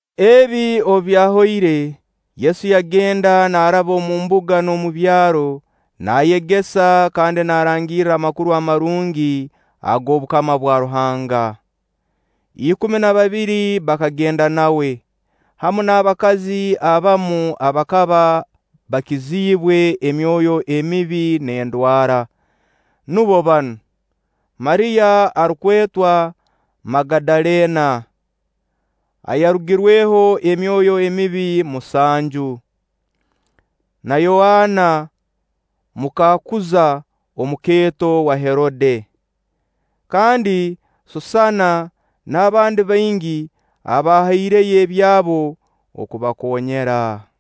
Ebi obu byahoire, Yesu yagenda naaraba omu mbuga n'omu byaro naayegesa kandi naarangirra Amakuru Amarungi ag'obukama bwa Ruhanga. Ikumi na babiri bakagenda nawe, hamu n'abakazi abamu abakaba bakiziibwe emyoyo emibi n'endwara. Nubo banu: Mariya arukwetwa Magadaleena ayarugirweho emyoyo emibi musanju, na Yoana muka Kuuza omukeeto wa Herode, kandi Susaana n'abandi baingi abahaireyo ebyabo okubakoonyera.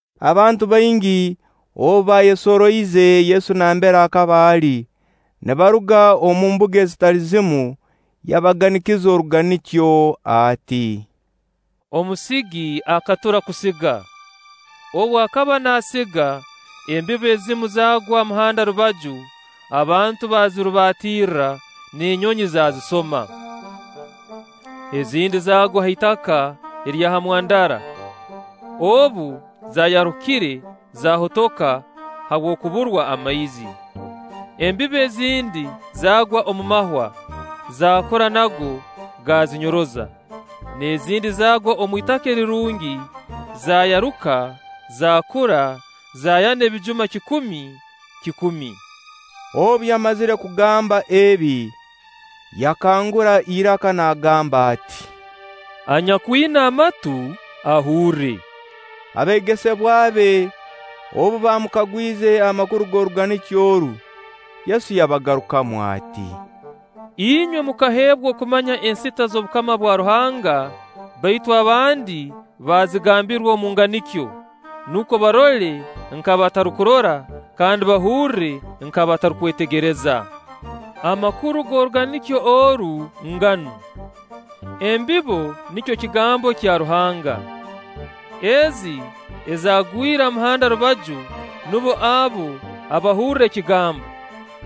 Abantu baingi obu baayesoroize Yesu nambere akaba ali, nibaruga omu mbuga ezitali zimu, yabaganikiza oruganikyo ati: “Omusigi akatura kusiga. Obu akaba naasiga, embibo ezimu zaagwa ha muhanda rubaju, abantu baazirubatirra, n'enyonyi zaazisoma. Ezindi zaagwa ha itaka erya ha mwandara, obu zaayarukire, zaahotoka habw'okuburwa amaizi. Embibo ezindi zaagwa omu mahwa; zaakura nago, gaazinyoroza. N'ezindi zaagwa omu itaaka erirungi, zaayaruka, zaakura, zaayana obujuma kikumi, kikumi.” Obu yamazire kugamba ebi, yakangura iraka naagamba ati: “Anyakwina amatu, ahurre!” Abeegesebwa be obu bamukagwize amakuru g'oruganikyo oru, Yesu yabagarukamu ati: “Inywe mukaheebwa okumanya ensita z'obukama bwa Ruhanga; baitu abandi bazigambirwa omu nganikyo, nukwo barole nk'abatarukurora, kandi bahurre nk'abatarukwetegereza.” Amakuru g'oruganikyo oru nganu: Embibo nikyo kigambo kya Ruhanga. Ezi ezaagwire ha muhanda rubaju nubo abo abahurra ekigambo;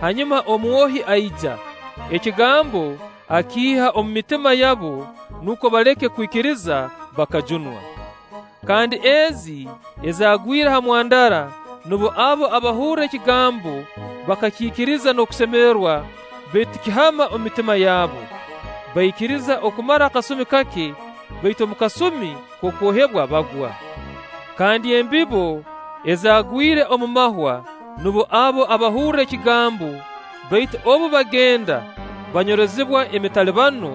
hanyuma omwohi aija, ekigambo akiiha omu mitima yabo, nukwo baleke kwikiriza bakajunwa. Kandi ezi ezaagwire ha mwandara nubo abo abahurra ekigambo bakakiikiriza n'okusemererwa; baitu tikihama omu mitima yabo. Baikiriza okumara akasumi kake, baitu omu kasumi k'okwohebwa bagwa. Kandi embibo ezaagwire omu mahwa nubo abo abahurra ekigambo, baitu obu bagenda, banyorozibwa emitalibano,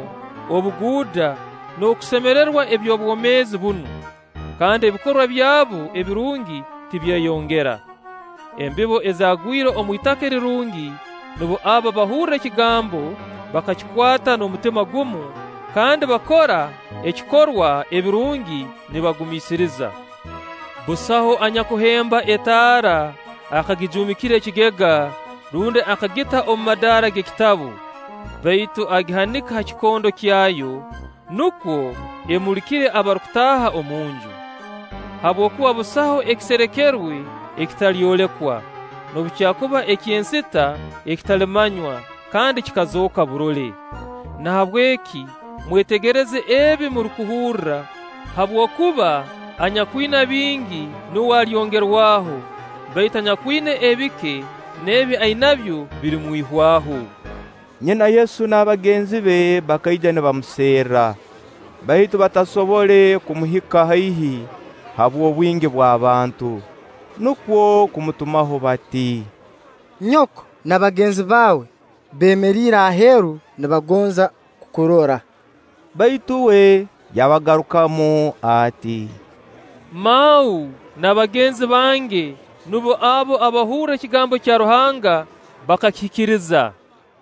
obuguuda, n'okusemerererwa eby'obwomeezi bunu; kandi ebikorwa byabo ebirungi tibyeyongera. Embibo ezaagwire omu itaka erirungi nubo abo abahurra ekigambo bakakikwata n'omutima gumu, kandi bakora ekikorwa ebirungi nibagumiisiriza. “Busaho anyakuhemba etaara, akagijuumikira ekigega, rundi akagita omu madaara g'ekitabu; baitu agihanika ha kikondo kyayo, nukwo emulikire abarukutaaha omu nju. Habwokuba busaho ekiserekerwe ekitalyolekwa, noobu kyakuba eky'ensita ekitalimanywa kandi kikazooka burole. Nahabweki mwetegereze ebi murukuhurra, kabwokuba anyakwina bingi nuwe alyongerwaho, baitu anyakwina ebike n'ebi ainabyo birimwihwaho.” Nyina Yesu n'abagenzi be bakaija nibamuserra, baitu batasobole kumuhika haihi habw'obwingi bw'abantu. Nukwo kumutumaho bati: “Nyoko n'abagenzi baawe beemeriire aheeru nibagonza kukurora.” Baitu uwe yabagarukamu ati: “Mau n'abagenzi bange nubo abo abahurra ekigambo kya Ruhanga bakakihikiriza.”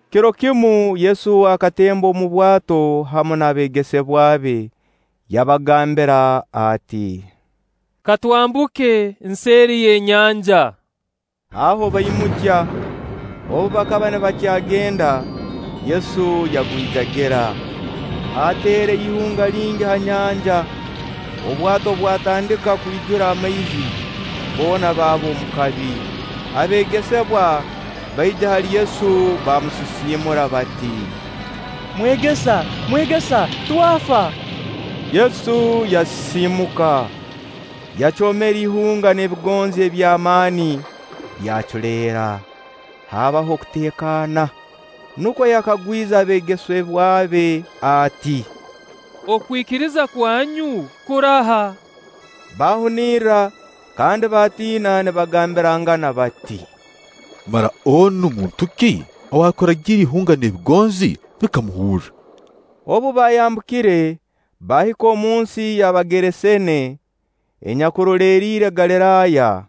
Kiro kimu Yesu akatemba omu bwato hamu n'abeegesebwa be, yabagambira ati: “Ka twambuke nseeri y'enyanja.” Aho baimukya. Obu bakaba nibakyagenda, Yesu yagwijagira. Haateera ihunga lingi ha nyanja, obwato bwatandika kwijura amaizi, boona baaba omu kabi. Abeegesebwa baija hali Yesu baamusisiimura bati: “Mwegesa, Mwegesa, twafa!” Yesu yasisiimuka, yacoomera ihunga n'ebigonzi eby'amaani; byaculeera, haabaho okuteekaana. Nubwo yakagwize abeegesebwa be ati: “Okwikiriza kwanyu kuraha?” Baahunirra kandi baatiina nibagambirangana bati: “Mara onu muntu ki arukuragira ihunga n'ebigonzi, bikamuhurra?” Obu baayambukire, baahika omunsi y'Abageraseene enyakuroleriire Galiraaya.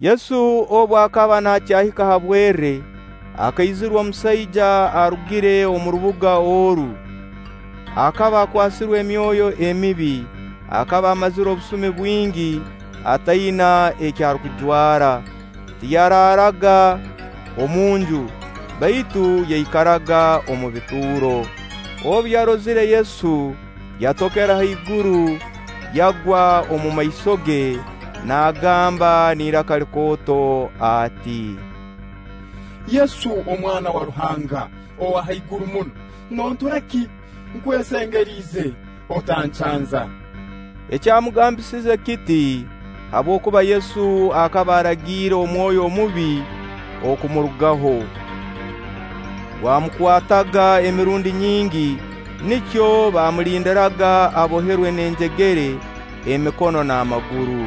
Yesu obu akaba nakyahika ha bwerre, akaizirwa omusaija arugire omu rubuga oru, akaba akwasirwe emyoyo emibi. Akaba amazire obusumi bwingi ataina eki arukujwara. Tiyaraaraga omunju, baitu yaikaraga omu bituuro. Obu yarozire Yesu, yatokera haiguru, yagwa omumaiso ge, naagamba n'iraka likooto ati: “Yesu Omwana wa Ruhanga owa haiguru muno, nontura ki? Nkwesengeriize, otancanza!” Ekyamugambisize kiti, habwokuba Yesu akaba aragiire omwoyo omubi okumurugaho. (Gwamukwataga emirundi nyingi, nikyo baamulindiraga aboherwe n'enjegere emikono n'amaguru,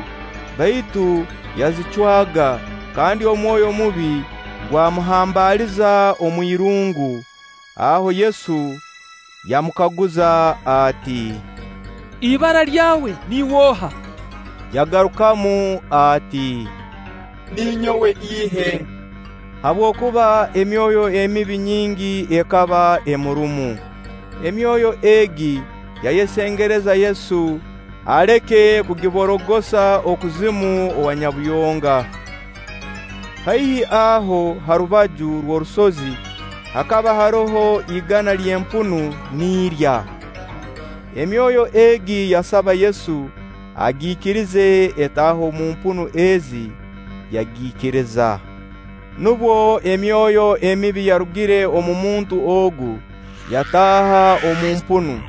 baitu yazicwaga kandi omwoyo mubi gwamuhambaaliza omwirungu.) Aho Yesu yamukaguza ati: “Ibara lyawe niiwe oha?” Yagarukamu ati: “Ninyowe Ihe”, habwokuba emyoyo emibi nyingi ekaba emurumu. Emyoyo egi yayesengereza Yesu aleke kugiborogosa okuzimu owa Nyabuyonga. Haihi aho ha rubaju rw'orusozi, hakaba haroho igana ly'empunu nirya. Emyoyo egi yasaba Yesu agiikirize etaahe omu mpunu ezi Yagiikiriza. Nubwo emyoyo emibi yarugire omu muntu ogu, yataaha omu mpunu,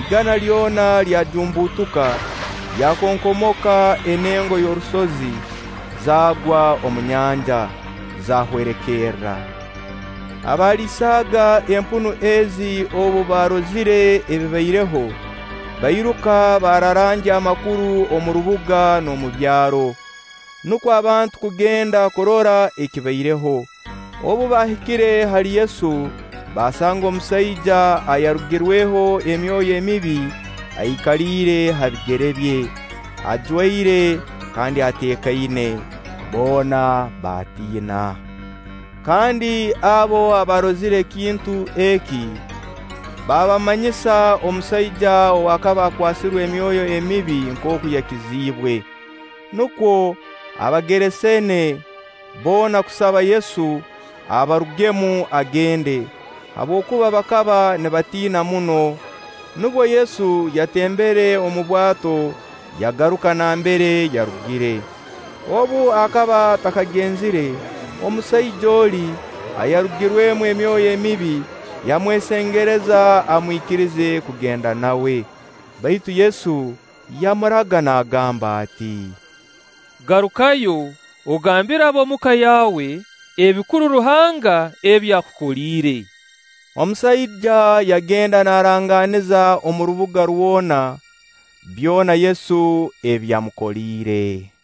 igana lyona lyajumbutuka, lyakonkomoka enengo y'orusozi, zaagwa omu nyanja, zaahwerekerra. Abaaliisaaga empunu ezi obu baarozire ebibaireho, bairuka baararangya amakuru omu rubuga n'omu byaro. Nukwo abantu kugenda kurora ekibaireho. Obu baahikire hali Yesu, baasanga omusaija ayarugirweho emyoyo emibi aikaliire ha bigere bye, ajwaire, kandi ateekaine. Boona baatiina. Kandi abo abaarozire ekintu eki, baabamanyisa omusaija ow'akaba akwasirwe emyoyo emibi nkooku yakiziibwe. Nukwo Abageraseene boona kusaba Yesu abarugemu agende, habwokuba bakaba nibatiina muno. Nubwo Yesu yatembere omu bwato yagaruka nambere yarugire. Obu akaba atakagenzire, omusaija oli ayarugirwemu emyoyo emibi yamwesengereza amwikirize kugenda nawe. Baitu Yesu yamuraga naagamba ati: “Garukayo, ogambire ab'omu ka yaawe ebikuru Ruhanga ebi akukoliire.” Omusaija yagenda naarangaaniza omu rubuga rwona byona Yesu ebi amukoliire.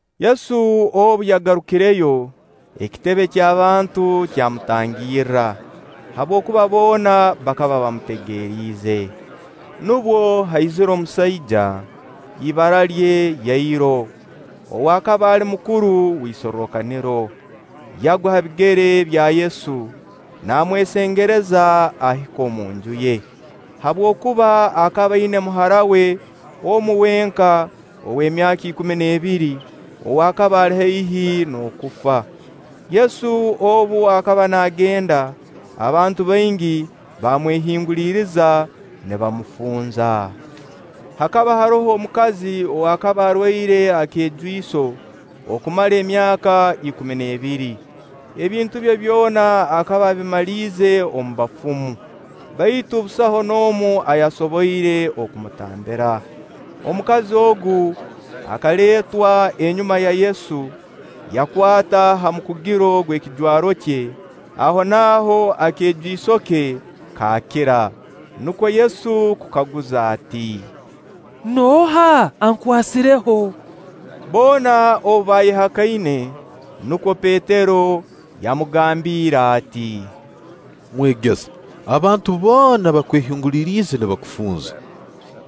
Yesu obu yagarukireyo, ekitebe ky'abantu kyamutangirra, habwokuba boona bakaba bamutegeriize. Nubwo haizire omusaija, ibara lye Yairo, ow'akaba ali mukuru w'isorrokaniro. Yagwa ha bigere bya Yesu, naamwesengereza ahike omu nju ye, habwokuba akaba aina muhara we omu wenka ow'emyaka ikumi n'ebiri, ow'akaba ali haihi n'okufa. Yesu obu akaba naagenda, abantu baingi baamwehinguliriza nibamufunza. Hakaba haroho omukazi ow'akaba arwaire akeejwiso okumara emyaka ikumi n'ebiri, ebintu bye byona akaba abimaliize omu bafumu, baitu busaho n'omu ayasoboire kumutambira. Omukazi ogu akaleetwa enyuma ya Yesu, yakwata ha mukugiro gw'ekijwaro kye, ahonaaho akeejwiso ke kaakira. Nukwo Yesu kukaguza ati: “Nooha ankwasireho?” Boona obu baayehakaine, nubwo Petero yamugambiire ati: “Mwegesa, abantu boona bakwehinguliriize nibakufunza.”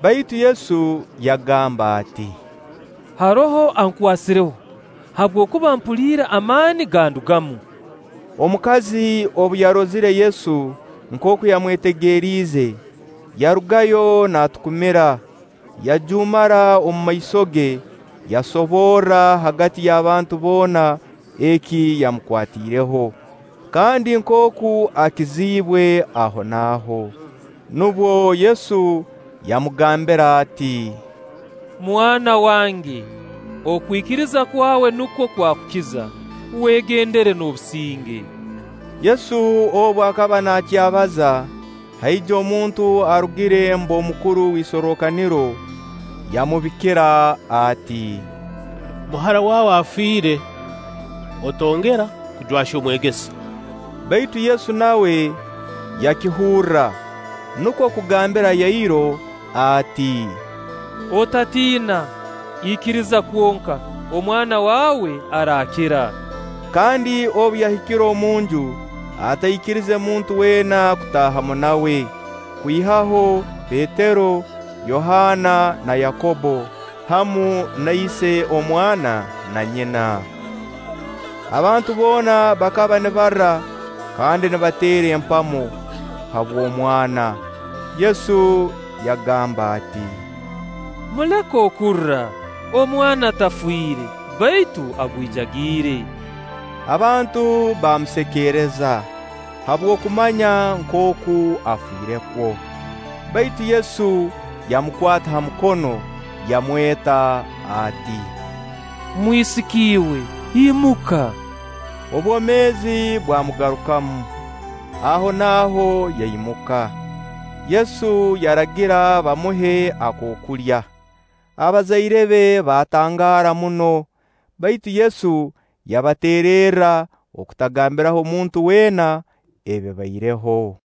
Baitu Yesu yagamba ati: “Haroho ankwasireho, habwokuba mpuliire amaani gandugamu.” Omukazi obu yarozire Yesu nkooku yamwetegeriize, yarugayo naatukumira, yajuumara omumaiso ge. Yasoborra hagati y'abantu boona eki yamukwatiireho, kandi nkooku akiziibwe ahonaaho. Nubwo Yesu yamugambira ati: “Mwana wange, okwikiriza kwawe nukwo kwakukiza, wegendere n'obusinge.” Yesu obu akaba naakyabaza, haija omuntu arugire mb'omukuru w'isorrokaniro, yamubikira ati: “Muhara waawe afiire, otongera kujwahya Omwegesa.” Baitu Yesu nawe yakihurra, nukwo kugambira Yairo ati: “Otatiina, ikiriza kwonka, omwana waawe araakira.” Kandi obu yahikire omunju, ataikirize muntu weena kutaahamu nawe, kwihaho Petero, Yohaana na Yakobbo, hamu na ise omwana na nyina. Abantu boona bakaba nibarra kandi nibateera empamo habw'omwana. Yesu yagamba ati: “Muleke kurra, omwana tafiire, baitu agwijagiire.” Abantu baamusekeereza, habw'okumanya nkooku afirekwo. Baitu Yesu yamukwata ha mukono, yamweta ati: “Mwisiki iwe, imuka!” Obwomeezi bwamugarukamu, ahonaaho yaimuka; Yesu yaragira bamuhe akookulya. Abazaire be baatangaara muno, baitu Yesu yabateererra okutagambiraho muntu weena ebibaireho.